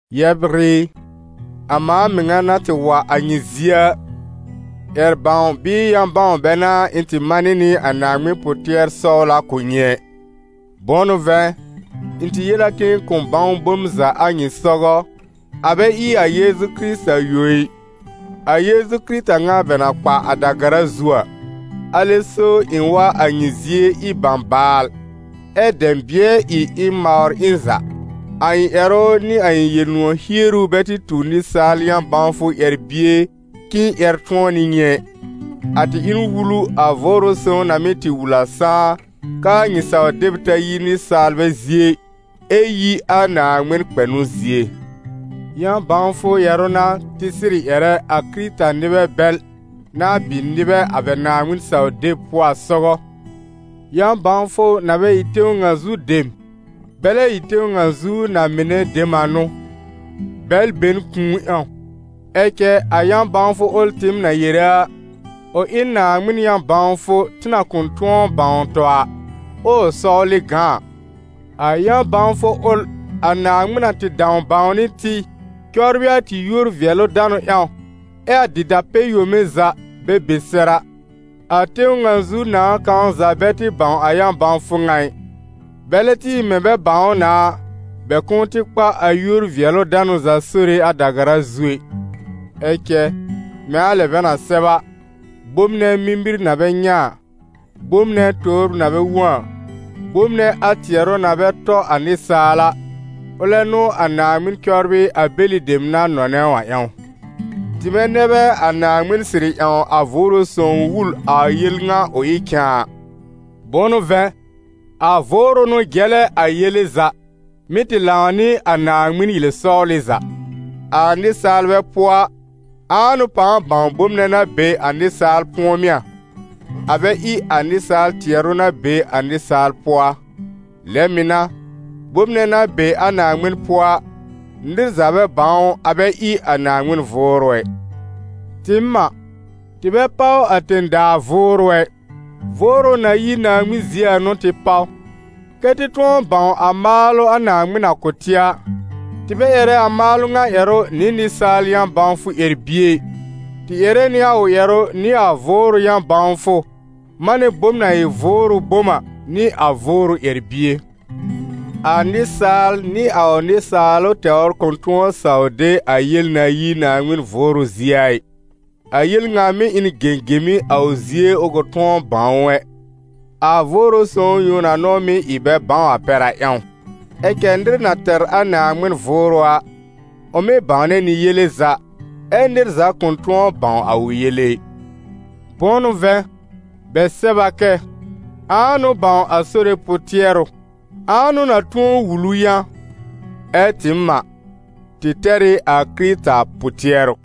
Yɛbr ɩ, a mãa mɩŋa na tɩ wa a nyɩ zie a, ƴɛr-bãw bɩɩ yã-bãw bɛ n'a ɩ̃ tɩ manɩ nɩ a Naaŋmɩn pʋ-tɩɛr-sɔwla kʋ̀ nyɩ ɛ. Bʋ̃ʋ n'ʋ vɛ̃, ɩ̃ tɩ yel a k'ɩ̃ɩ kʋ̃ bãw bom za a nyɩ sɔgɔ, a bɛ ɩ a Yeezu Kɩrɩta yõ ɩ, a Yeezu Kɩrɩta ŋa bɛ na kpa a da-gara zu a. Alɛ so ɩ̃ wa a nyɩ zie ɩ bãbaal, ɛ́ dɛ̃bɩ̃ɛ ɩ ɩ̃ mawr ɩ̃ za; a ɩ̃ ƴɛrʋ nɩ a ɩ̃ Yel-nʋ̃ɔ̀ hieru bɛ tɩ tu nɩsaal yã-bãwfʋ ƴɛr-bie k'ɩ̃ɩ ƴɛr tʋ̃ɔ nɩ nyɩ ɛ, a tɩ ɩ n wulu a Vʋʋrʋ Sõw na mɩ́ tɩ wul a sãá a, k'aa nyɩ saw-deb ta yi nɩsaalbɛ zie ɩ, ɛ yi a Naaŋmɩn kpɛnʋ zie. Yã-bãwfʋ ƴɛrʋ n'a tɩ sɩrɩ ƴɛrɛ a Kɩrɩta-nɩbɛ bɛl na bɩ nɩbɛ a bɛ Naaŋmɩn-saw-deb pʋɔ a sɔgɔ, yã-bãwfʋ na bɛ ɩ tẽw ŋa zu dem, bɛ lɛ ɩ tẽw ŋa zu na-mɩnɛ dem a n'ʋ, bɛl be n kũu ƴãw. Ɛ cɛ a yã-bãwfʋ ʋl tɩɩm na yere a, ʋ ɩ n Naaŋmɩn yã-bãwfʋ tɩ na kʋ̃ tʋ̃ɔ bãw tɔ a, ɛ ʋ sɔwlɩ gã a. A yã-bãwfʋ ʋl a Naaŋmɩn na tɩ dãw bãwnɩ tɩ cɔbrɩ a tɩ yúor-vɩɛlʋ-danʋ ƴãw, ɛ a dɩta-pɛ-yome za bɛ be sɛr a. A tẽw ŋa zu nãà kãw za bɛ tɩ bãw a yã-bãwfʋ ŋa ɩ. Bɛlɛ tɩ ɩ mɛ̃ bɛ bãw ʋ na a, bɛ kʋ̃ʋ tɩ kpa a yúor-vɩɛlʋ-danʋ za Sore a da-gara zu ɛ. Ɛ cɛ, mɛ̃ a lɛ bɛ na sɛb a: «Bom nɛ mimir na bɛ nyɛ̃ a, bom nɛ tobr na bɛ wõ a, bom nɛ a tɩɛrʋ na bɛ tɔ a nɩsaal a, ʋlɛ n'ʋ a Naaŋmɩn cɔbrɩ a bɛlɩ dem na nɔnɛ ʋ a ƴãw.» Tɩmɛ nɛ bɛ a Naaŋmɩn sɩrɩ ƴãw a Vʋʋrʋ Sõw wul a yel ŋa ʋ ɩ cãa. Bʋ̃ʋ n'ʋ vɛ̃, a Vʋʋrʋ n'ʋ jɛlɛ a yele za, mɩ́ tɩ lãw nɩ a Naaŋmɩn yel-sɔwlɩ za. A nɩsaalbɛ pʋɔ a, ãa n'ʋ pãa bãw bom nɛ na be a nɩsaal pʋ̃ɔmɩ́ a, a bɛ ɩ a nɩsaal tɩɛrʋ na be a nɩsaal pʋɔ a? Lɛ mɩ̀ n'a, bom nɛ na be a Naaŋmɩn pʋɔ a, nɩr za bɛ bãw ʋ a bɛ ɩ a Naaŋmɩn Vʋʋrʋ ɛ. Tɩɩm a, tɩ bɛ páw a tẽ-daa vʋʋrʋ ɛ, Vʋʋrʋ na yi Naaŋmɩn zie a n'ʋ tɩ páw, kɛ́ tɩ tʋ̃ɔ bãw a maalʋ a Naaŋmɩn na kʋ̀ tɩ a. Tɩ bɛ ƴɛrɛ a maalʋ a ŋa ƴɛrʋ nɩ nɩsaal yã-bãwfʋ ƴɛr-bie ɩ, tɩ ƴɛrɛ nɩ a ƴɛrʋ nɩ a Vʋʋrʋ yã-bãwfʋ, manɛ bom na ɩ vʋʋrʋ bom a, nɩ a Vʋʋrʋ ƴɛr-bie. A nɩsaal nɩ a ʋ nɩsaalʋ tɛwr kʋ̃ tʋ̃ɔ saw de a yel na yi Naaŋmɩn Vʋʋrʋ zie a ɩ. A yel ŋa mɩ́ ɩ n gẽgẽmi a ʋ zie ʋ kʋ̃ tʋ̃ɔ bãw ʋ ɛ, a Vʋʋrʋ Sõw yõ na n'ʋ mɩ́ ɩ bɛ bãw a pɛr a ƴãw. Ɛ cɛ nɩr na tɛr a Naaŋmɩn Vʋʋrʋ a, ʋ mɩ́ bãwnɛ nɩ yele za, ɛ́ nɩr za kʋ̃ tʋ̃ɔ bãw a ʋ yele ɩ. Bʋ̃ʋ n'ʋ vɛ̃, bɛ sɛb a kɛ: «Ãa n'ʋ bãw a Sore pʋ-tɩɛrʋ? Ãa n'ʋ na tʋ̃ɔ wul ʋ yã?» Ɛ tɩɩm a, tɩ tɛr ɩ a Kɩrɩta pʋ-tɩɛrʋ.